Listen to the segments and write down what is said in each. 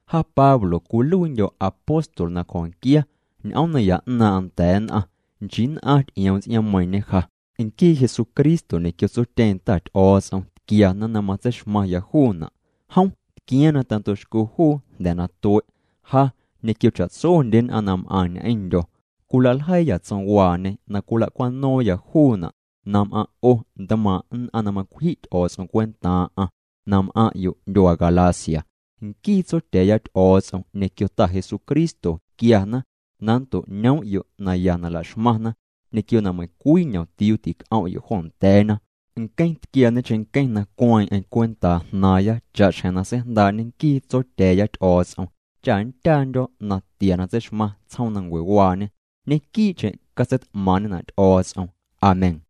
Ja Pablo cwiluiindyo̱ apóstol na cjo̱nquia ñ'oom naya 'naaⁿ'aⁿ nda̱a̱ nn'aⁿ. Nchii nn'aⁿ ty'ioom ts'iaaⁿmeiiⁿñe ja. Nquii Jesucristo ñequio tsotyeeⁿ Ta Ty'o̱o̱ts'om tquiana na matseixmaⁿya juuna'. Jom tquiaaⁿ na tando'xco juu jnda̱ na tue'. Ja ñequio cha'tsondye nn'aⁿ na m'aⁿ ñ'eⁿndyo̱ cwilaljeiiya tsomwaañe na cwila'cwano̱o̱ⁿya juuna' na m'aⁿ' 'o ntmaaⁿ nn'aⁿ na macwji' Ty'o̱o̱ts'om cwentaaⁿ'aⁿ na m'aⁿ'yo' ndyuaa Galacia. Nquii Tsotya̱a̱ya Ty'o̱o̱ts'om ñequio Ta Jesucristo quiana na nnto'ñoom'yo' naya na la'xmaⁿna ñequio na meiⁿcwii ñomtiuu tic'om'yo' joo nda̱a̱na. Nqueⁿ tquiaañe cheⁿnqueⁿ na cueeⁿ'eⁿ cwentaa jnaaⁿya cha'xjeⁿ na seijndaa'ñe nquii Tsotya̱a̱ya Ty'o̱o̱ts'om cha nndyaandyo̱ natia na tseixmaⁿ tsjoomnancuewaañe. Ñequii'cheⁿ catseit'maaⁿ'ñena' Ty'o̱o̱ts'om. Amén.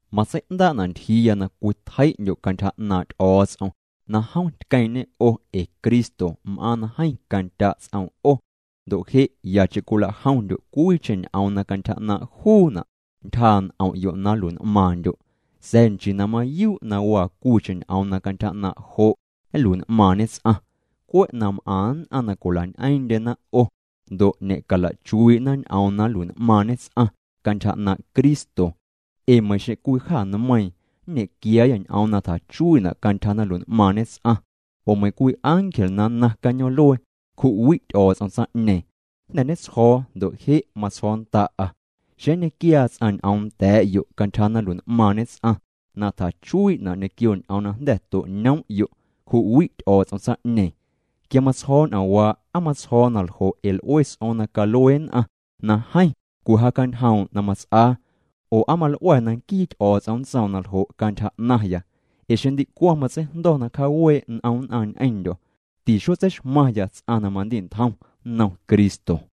Matsei'ndaa'na' ntyjiiya na cwitjei'ndyo' cantyja 'naaⁿ' Ty'o̱o̱ts'om na jom tqueeⁿ'ñê 'o ee Cristo m'aaⁿ na jeeⁿ candya' ts'oom 'o ndo' je' yacheⁿ cwila'jomndyo' cwiicheⁿ ñ'oom na cantyja 'naaⁿ' juuna' ntyjaa' n'om'yo' na nlui'n'maaⁿndyo'. Sa̱a̱ nchii na mayuu' na waa cwiicheⁿ ñ'oom na cantyja 'naaⁿ' jo' nlui'n'maaⁿñe ts'aⁿ. Cwe' na m'aⁿ nn'aⁿ na cwila'ñ'eeⁿ'ndyena 'o ndo' ñe'cala'chuii'na ñ'oom na nlui'n'maaⁿñe ts'aⁿ cantyja 'naaⁿ' Cristo. Ee meiiⁿ xeⁿ cwii jâ nmeiiⁿ nñequiaayâ ñ'oom na tjachuii'na' cantyja na nlui'n'maaⁿñe ts'aⁿ, oo meiiⁿ cwii ángel na nnaaⁿ cañoom'luee, cju'wi' Ty'o̱o̱ts'om tsaⁿ'ñeeⁿ. Jnda̱ ñetsjo̱o̱ ndo' je' matsjo̱o̱ nnda'a: Xeⁿ nñequiaa ts'aⁿ ñ'oom nda̱a̱'yo' cantyja na nlui'n'maaⁿñe ts'aⁿ na tjachuii'na' ñequio ñ'oom na jnda̱ to'ñoom'yo', cju'wi' Ty'o̱o̱ts'om tsaⁿ'ñeeⁿ. Quia matsjo̱o̱ ñ'oomwaa' ¿aa matsjo̱o̱ naljo' ee l'ue ts'o̱o̱ⁿ na calue nn'aⁿ na jeeⁿ cwijaacanjoom' na mats'aa oo na nquii Ty'o̱o̱ts'om nntsoom na ljo' cantyja 'naⁿya? Ee xeⁿ ndicwaⁿ matseijndo̱ na cjawee' n'om nn'aⁿ ñ'eⁿndyo̱, tixotseixmaⁿya ts'aⁿ na mandi'ntjom nnom Cristo.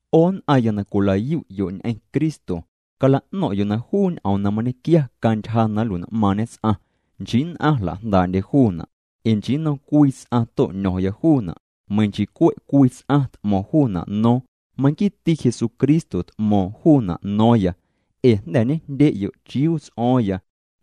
'O nn'aⁿya na cwila'yu'yo' ñ'eⁿ Cristo, cala'no̱ⁿ'yo' na juu ñ'oom na mañequia cantyja na nlui'n'maaⁿñe ts'aⁿ, nchii nn'aⁿ jla'jndaa'ndye juuna'. Ee nchii nnom cwii ts'aⁿ to'ño̱ⁿya juuna' meiiⁿ nchii cwe' cwii ts'aⁿ t'mo̱ⁿ juuna' no̱o̱ⁿ, manquiiti Jesucristo t'mo̱o̱ⁿ juuna' no̱o̱ⁿya. Ee jnda̱ ñejndye'yo' chiuu ts'o̱o̱ⁿya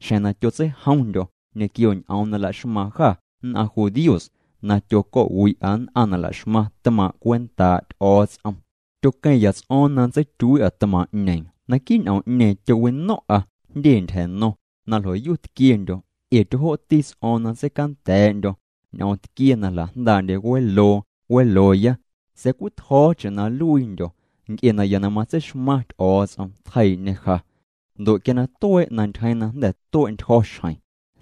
xjeⁿ na tyotseijomndyo̱ ñequio ñ'oom na laxmaaⁿ jâ nn'aⁿ judíos, na tyoco̱'wi'a nn'aⁿ na laxmaⁿ tmaaⁿ' cwentaa' Ty'o̱o̱ts'om. Tyoqueⁿya ts'o̱o̱ⁿ na nntseityuii'a tmaaⁿ'ñeeⁿ. Naquii' ñ'oom'ñeeⁿ, tyowino̱ⁿ'a jndye ntyja̱no̱ⁿ na ljoyu tquiendyo̱, ee tyojoo'ti ts'o̱o̱ⁿ na nntseicanda̱a̱'ndyo̱ ñ'oom tquie na jla'jndaa'ndye weloo welooya. Sa̱a̱ cwitjo̱o̱cheⁿ na nluiindyo̱, nc'e naya na matseixmaⁿ Ty'o̱o̱ts'om tjeiiⁿ'ñe ja. Ndo' quia na tuee' na ntyjeeⁿ na jnda̱ tue'ntyjo̱ xjeⁿ,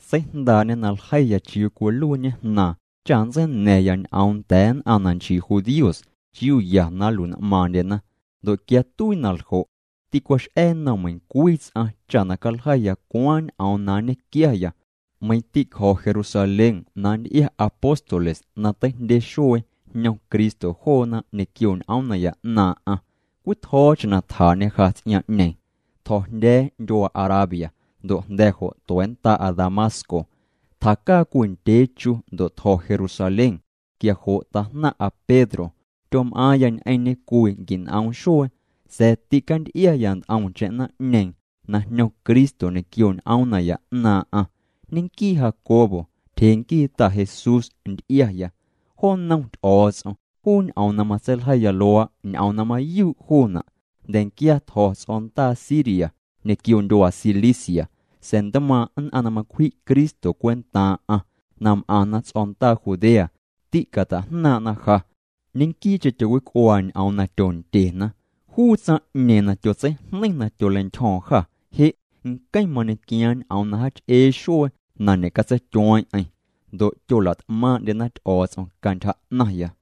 seijndaa'ñê na ljeiya chiuu cwiluiiñe Jnaaⁿ cha nntseina̱ⁿya ñ'oom nda̱a̱ nn'aⁿ na nchii judíos chiuu ya na nlui'n'maaⁿndyena. Ndo' quia tuii na ljo', tîcwax'a̱ nnom meiⁿcwii ts'aⁿ cha na caljeiya cwaaⁿ ñ'oom na nñequiaya. Meiⁿ tîcjo̱ Jerusalén na nty'ia apóstoles na teijndye xuee jñom Cristo joona ñequio ñ'oom naya 'naaⁿ'aⁿ cwitjo̱o̱cheⁿ na tjaa'ñê ja ts'iaaⁿ'ñeeⁿ. Tjo̱jndya̱a̱ ndyuaa Arabia, ndo' jnda̱ jo' tua̱nnda'a Damasco. Tjacaa cwii ndyee chu ndo' tjo̱ Jerusalén. Quia jo' tajnaⁿ'aⁿ Pedro. Tyom'aaⁿya ñ'eⁿñê cwii quin'oom xuee. Sa̱a̱ tîcanty'iaya nt'omcheⁿ naⁿ'ñeeⁿ na jñom Cristo ñequioñ'oom naya 'naaⁿ'aⁿ, ñenquii Jacobo, tyjee nquii Ta Jesús, nty'iaya. Jo nnom Ty'o̱o̱ts'om, juu ñ'oom na matseiljeiya luaa', ñ'oom na mayuu' juuna'. Jnda̱nquia tjo̱ ts'o̱ndaa Siria ñequio ndyuaa Cilicia. Sa̱a̱ ntmaaⁿ' nn'aⁿ na macwji' Cristo cwentaaⁿ'a na m'aⁿna ts'o̱ndaa Judea, tîcata'jnaaⁿ'na ja. Ñenquii'cheⁿ tyowic'uaa ñ'oom na tyondyena: “Juu tsaⁿ'ñeeⁿ na tyotseijneiⁿ na tyoleintyjo̱o̱ⁿ jâ, je' nqueⁿ mañequiaaⁿ ñ'oom na jaach'ee xuee na ñe'catseityueeⁿ'eⁿ.” Ndo' tyola't'maaⁿ'ndyena Ty'o̱o̱ts'om cantyja 'naⁿya.